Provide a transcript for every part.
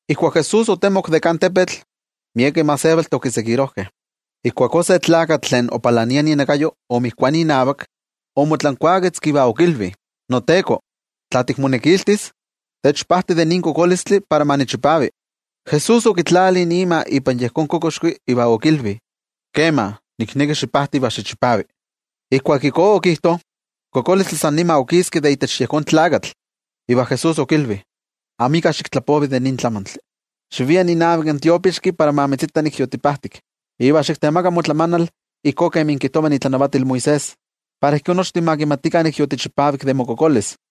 Ijkuak Jesús otemok de kan tepetl, miekeh gentejtih okitokakeh. Ijkuakó se tlakatl tlen opalania inakayo omotoki inavak, omotlankuaketzki iva okilvi: —NoTeko, tla tikmonekiltis, techpajti de nin kokolistli para ma nichipavi. Jesús okitlali ima ipan yejón kokoxki iva okilvi: —Kema. Nikneki xipajti iva xichipavi. Ijkuak ijkó okijto, in kokolistli san nima okiski de itech yejón tlakatl. Iva Jesús okilvi: —Amika xiktlapovi de nin tlamantli. Xivia inavak in tiopixki para ma mitzita nik yotipajtik, iva xiktemaka motlamanal ijkó kemi kijtova itlanavatil Moisés, para ijkó nochtin ma kimatikah nik yotichipavik de mokokolis.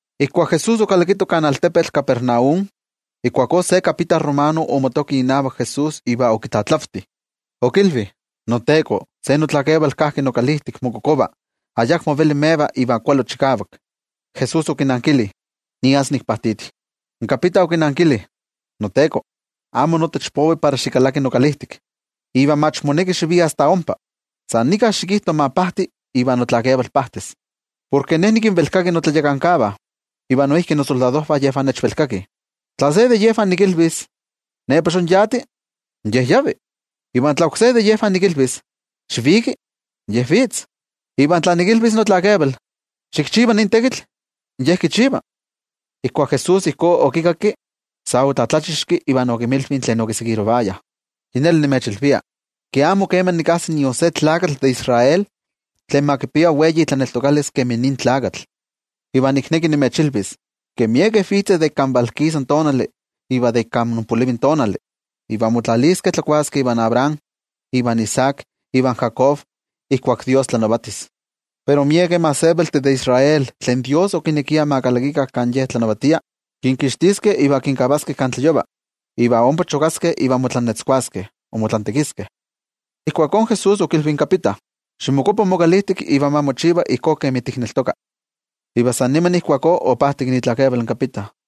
Ijkuak Jesús okalakito kan altepetl Capernaum, ijkuakó se kapita romano omotoki inavak Jesús iva okitlatlavti, okilvi: —NoTeko, se notlakeval kajki nokalijtik mokokova, ayakmo veli meva iva chikavak kualo. Jesús okinankili: —Nias nikpajtiti. In kapita okinankili: —NoTeko, amo notech povi para xikalaki nokalijtik. Iva mach moneki xivia asta ompa, san nika xikijto ma pajti iva notlakeval pajtis. Porke ne nikinvelkaki notlayakankavah, iva noijki nosoldadojvah yejvah nechvelkakih. Tla se de yejvah nikilvis: “Nepa xonyati”, in ye yavi. Iva tla oksé de yejvah nikilvis: “Xiviki”, in ye vitz. Iva tla nikilvis notlakeval: “Xikchiva nin tekitl”, in ye kichiva. Ijkuak Jesús ijkó okikakki, sa otlatlachixki iva okinmilvi tlen okitokayah: —Yi neli nimechilvia, ke amo kema nikajsi nion se tlakatl de Israel, tlen ma kipia wei itlaneltokalis kemi nin tlakatl. Iva nikneki nimechilvis ke miekeh vitzeh de ik kan valkisa tonali iva de ik kan onpolivi tonali, iva motlaliskeh tlakuaskeh ivan Abraham, ivan Isaac ivan Jacob ijkuak Dios tlanavatis. Pero miekeh gentejtih de Israel tlen Dios okinekiah ma kalakikah kan Ye tlanavatia, kinkixtiskeh iva kinkavaskeh kan tlayova, iva ompa chokaskeh iva motlantekiskeh. Ijkuakó Jesús okilvi in kapita: —Ximokuapa mokalijtik, iva ma mochiva ijkó kemi tikneltoka. Iva san nima ijkuakó opajtik itlakeval in kapita.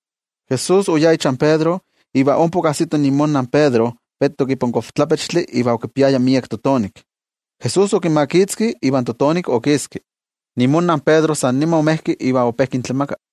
Jesús oyá ichan Pedro, iva ompa okajsito imonna in Pedro vetok ipan kochtlapechtli iva okipiaya miek totonik. Jesús okimakitzki, iva in totonik okiski. Imonna in Pedro san nima omejki iva ope kintlamaka.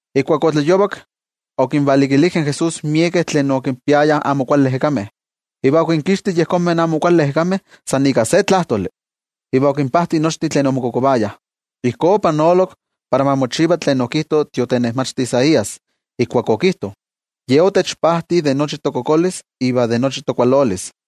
Ijkuak otlayovak, okinvalikilijkeh in Jesús miekeh tlen okinpiayah amo kuali ejekameh. Iva okinkixti yejonmeh amo kuali ejekameh san ika se tlajtoli, iva okinpajti nochtin tlen omokokovayah. Ijkó opanolok para ma mochiva tlen okijto in tiotenejmachti Isaías, ijkuak okijto: “Ye otechpajti de nochi tokokolis iva de nochi tokualolis.”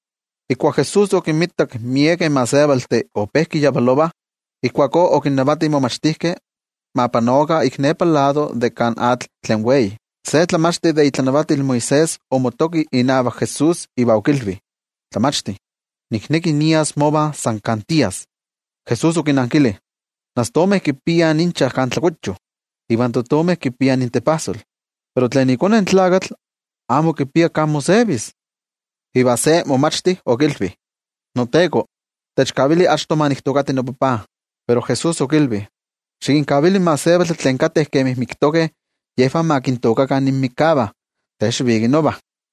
Ijkuak Jesús okinmitak miekeh gentejtih ope kiyavalovah, ijkuakó okinnavati in momachtijkeh ma panokah ik nepa lado de kan atl tlen wei. Se tlamachti de itlanavatil Moisés omotoki inavak Jesús iva okilvi: —Tlamachti, nikneki nias mova san kan tias. Jesús okinankili: —In astomeh kipiah inchah kan tlakuyo ivan totomeh kipiah intepajsol. Pero iKone in Tlakatl amo kipia kan mosevis. Iva se momachti okilvi: —NoTeko, techkavili achto ma niktookati nopapa. Pero Jesús okilvi: —Xikinkavili in gentejtih tlen kateh kemi miktokeh yejvah ma kintookakah inmikavah, te xiviki nova.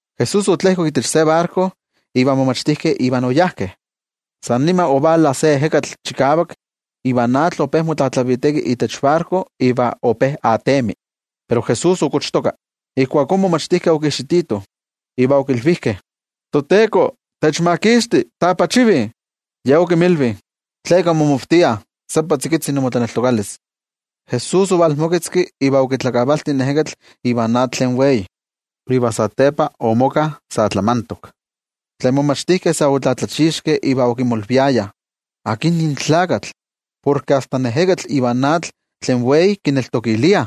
Jesús otlejkok itech se barko, iva in momachtijkeh oyajkeh Iva. San nima ovala se ejekatl chikavak iva in atl ope motlatlaviteki itech barko iva ope atemi. Pero Jesús okochtoka. Ijkuakó in momachtijkeh okijxititoh, iva okilvijkeh: —¡ToTeko, techmakixti! ¡Tapoolakih! Ye okinmilvi: —¿Tleka inmomavtiah? ¡Seppa tzikitzi imotlaneltokalis! Jesús omoketzki iva okitlakavalti in ejekatl ivan atl tlen wei, iva satepa omoka sa tlamantok. Tlen momachtijkeh sa otlatlachixkeh iva okimolviayah: —¿Akin nin tlakatl, porke asta in ejekatl ivan atl tlen wei kivelkakih?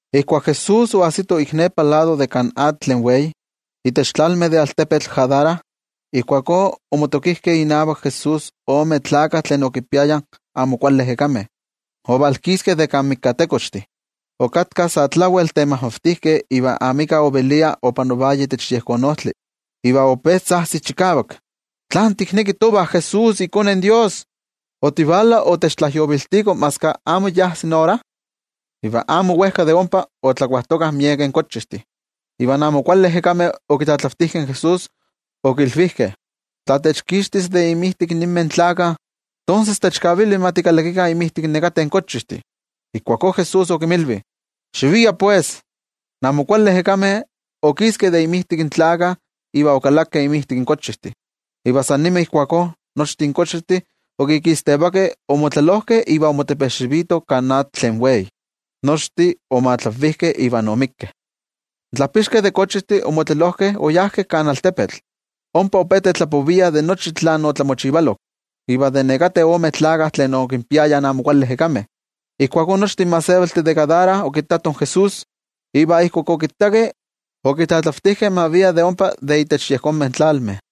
Ijkuak Jesús oajsito ik nepa lado de kan atl tlen wei, itech tlalmeh de altepetl Gadara, ijkuakó omotokijkeh inavak Jesús omen tlakah tlen okinpiayah amo kuali ejekameh, ovalkiskeh de kan mikatekochtih. Okatkah sa tlawel temajmavtijkeh iva amika ovelia opanovaya itech yejón ojtli. Iva ope tzajtzih chikavak: —¿Tlán tikneki tovah Jesús iKone in Dios? ¿Otivala otechtlajyoviltiko maski ayamo ajsi ora? Iva amo wejka de ompa, otlakuajtokah miekeh kochijtih. Iva in amo kuali ejekameh okitlatlavtijkeh in Jesús, okilvijkeh: —Tla techkixtis de inmijtik ninmeh tlakah, tonses techkavili ma tikalakikah inmijtik nekateh kochijtih. Ijkuakó Jesús okinmilvi: —Xiviah pues. In amo kuali ejekameh okiskeh de inmijtik in tlakah iva okalakeh inmijtik in kochijtih. Iva san nima ijkuakó nochtin kochijtih okikistevakeh omotlelojkeh iva omotepejxivitoh kan atl tlen wei, nochtin omatlanvijkeh. In tlajpixkeh de kochijtih omotlelojkeh oyajkeh kan altepetl. Ompa ope tetlapoviah de nochi tlen otlamochivalok, iva de nekateh omen tlakah tlen okinpiayah amo kuali ejekameh. Ijkuakó nochtin gentejtih de Gadara okittatoh in Jesús, iva ijkuak okittakeh, okitlatlavtijkeh ma via de ompa de itech yejonmeh tlalmeh.